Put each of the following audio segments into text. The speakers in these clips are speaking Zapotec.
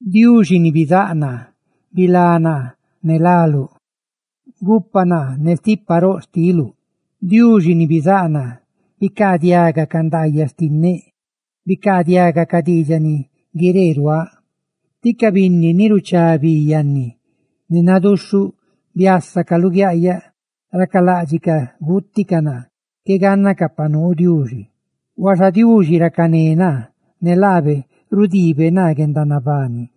¡Diuxi ni bizáꞌ naa, bilá naa ne láluꞌ! ¡Gupa naa ne stipa roꞌ xtiluꞌ! Diuxi ni bizáꞌ naa, bicaadiaga ca ndaayaꞌ xtinneꞌ; bicaadiaga ca diidxaꞌ ni guiree ruaaꞌ, tí ca binni ni ruchá bi yanni ne naduxhuꞌ biásacaꞌ luguiaꞌyaꞌ, racaláꞌdxicaꞌ guuticaꞌ naa. ¡Qué gánnacaꞌ pa nuu Diuxi! Huaxa Diuxi, racané naa; ne laabe rudiibe naa guendanabani.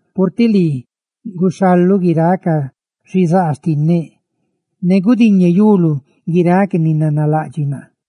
purtiꞌ lii guxhaluꞌ guiráꞌ ca xizaa xtinneꞌ ne gudiñeyuluꞌ guiráꞌ ca ni nanalaꞌdxiꞌ naa.